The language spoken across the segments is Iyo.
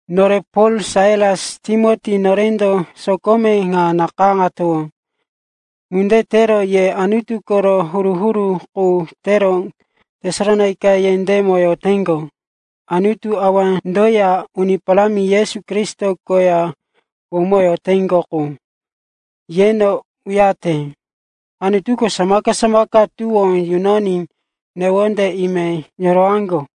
Nore Pol, Sailas, Timoti, norendo sokome ŋa nakayáŋatowó. Ŋunde tero ye Anutu koro huru-huru qu tero Tesalonaika yendémo yoteŋgo, Anutu Awandoya Uni Parámi Yesu Kristo koya womoyoteŋgo qu, yeno uyarete. Anutuko samaka-samaka tuwó yunoní newonde ime yorowaŋgo.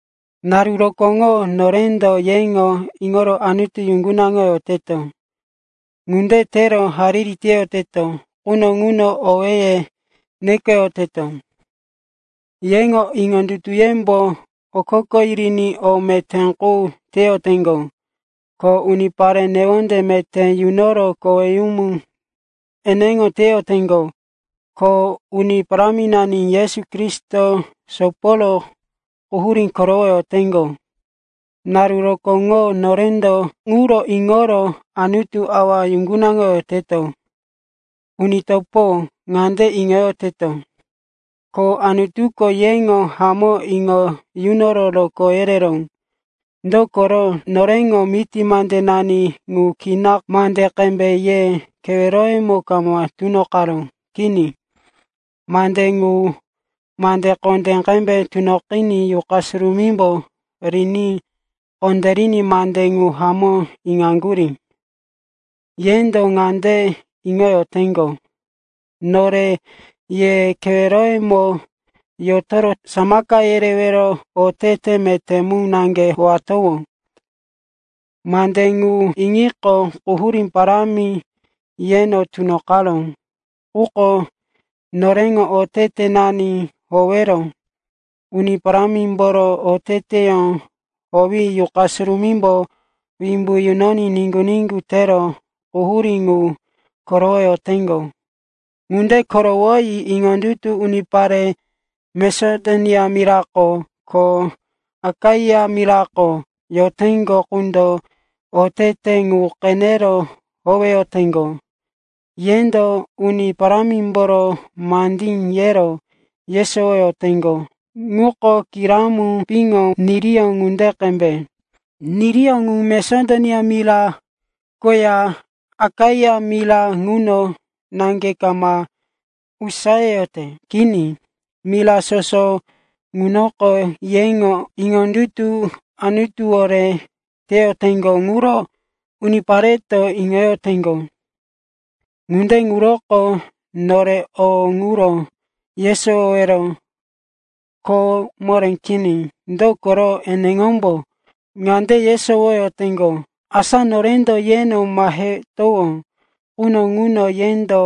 Naru rokóŋo norendo yeŋo iŋoro Anutu yuŋgunaŋoyoteto. Ŋunde tero hariri teyoteto quno ŋuno owéye nekoyoteto. Yeŋo iŋondutuyembo okoko yiriní o meté qu teyoteŋgo, ko unipare newonde meté yunoro koweyumu eneŋo teyoteŋgo, ko Uni Paráminani Yesu Kristo soporo quhurí korowoyoteŋgo. Naru rokóŋo norendo ŋuro iŋoro Anutu Awa yuŋgunaŋoyoteto. Uni topo, ŋande iŋoyoteto, ko Anutuko yeŋo hamó iŋo yunoro rokó yereró. Dokoro noreŋo miti mandenani ŋu kina mande qembe ye keweroyemo kama tunoqaró. Kini, mande ŋu mande kondé qembe tunoqiní Yuqa Surumímbo riní kondériní mande ŋu hamó iŋaŋgurí. Yendo ŋande iŋoyoteŋgo, nore ye keweroyemo yotoro samaka yerewero otete meté mu naŋge howatowó. Mande ŋu iŋiqo, quhurí parámi yeno tunoqaró. Quko noreŋo otetenani howero Uni Parámimboro oteteyó howi Yuqa Surumímbo wimbu yunoní niŋgu-niŋgu tero quhurí ŋu korowoyoteŋgo. Ŋunde korowoyi iŋondutu unipare Masedonia mirako, ko Akaia mirako yoteŋgo qundo otete ŋu qenero howeyoteŋgo. Yendo Uni Parámimboro mandí yero yesowoyoteŋgo ŋuko giramu piŋo niriyó ŋunde qembe. Niriyó ŋu Masedonia mira koya Akaia mira ŋuno naŋge kama usayeyote. Kini, mira soso ŋunoko yeŋo iŋondutu Anutuwore teyoteŋgo ŋuro unipareto iŋoyoteŋgo. Ŋunde ŋuroko nore o ŋuro yesowowero kho moré kini. Dokoro eneŋombo ŋande yesowoyoteŋgo, asa norendo yeno mahetowó quno ŋuno yendo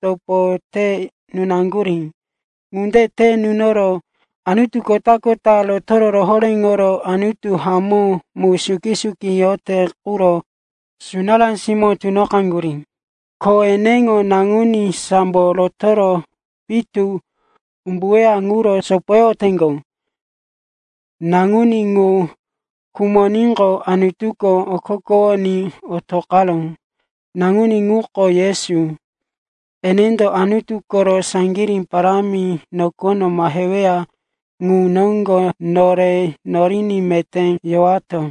topo te nunaŋgurí. Ŋunde te nunoro anutu kota-kota rotoro rohoréŋoro Anutu hamó mu suki-suki yorote quro sunará simóŋo tunoqaŋgurí. Ko eneŋo Naŋuní sambo rotoro pitu umbuweya ŋuro sopoyoteŋgo. Naŋuní ŋu khumoníqo, Anutuko okokowoní otoqaró. Naŋuní ŋuko Yesu, enendo Anutu koro saŋgirí parámi nokono maheweya ŋu noŋgo nore noriní meté yowato.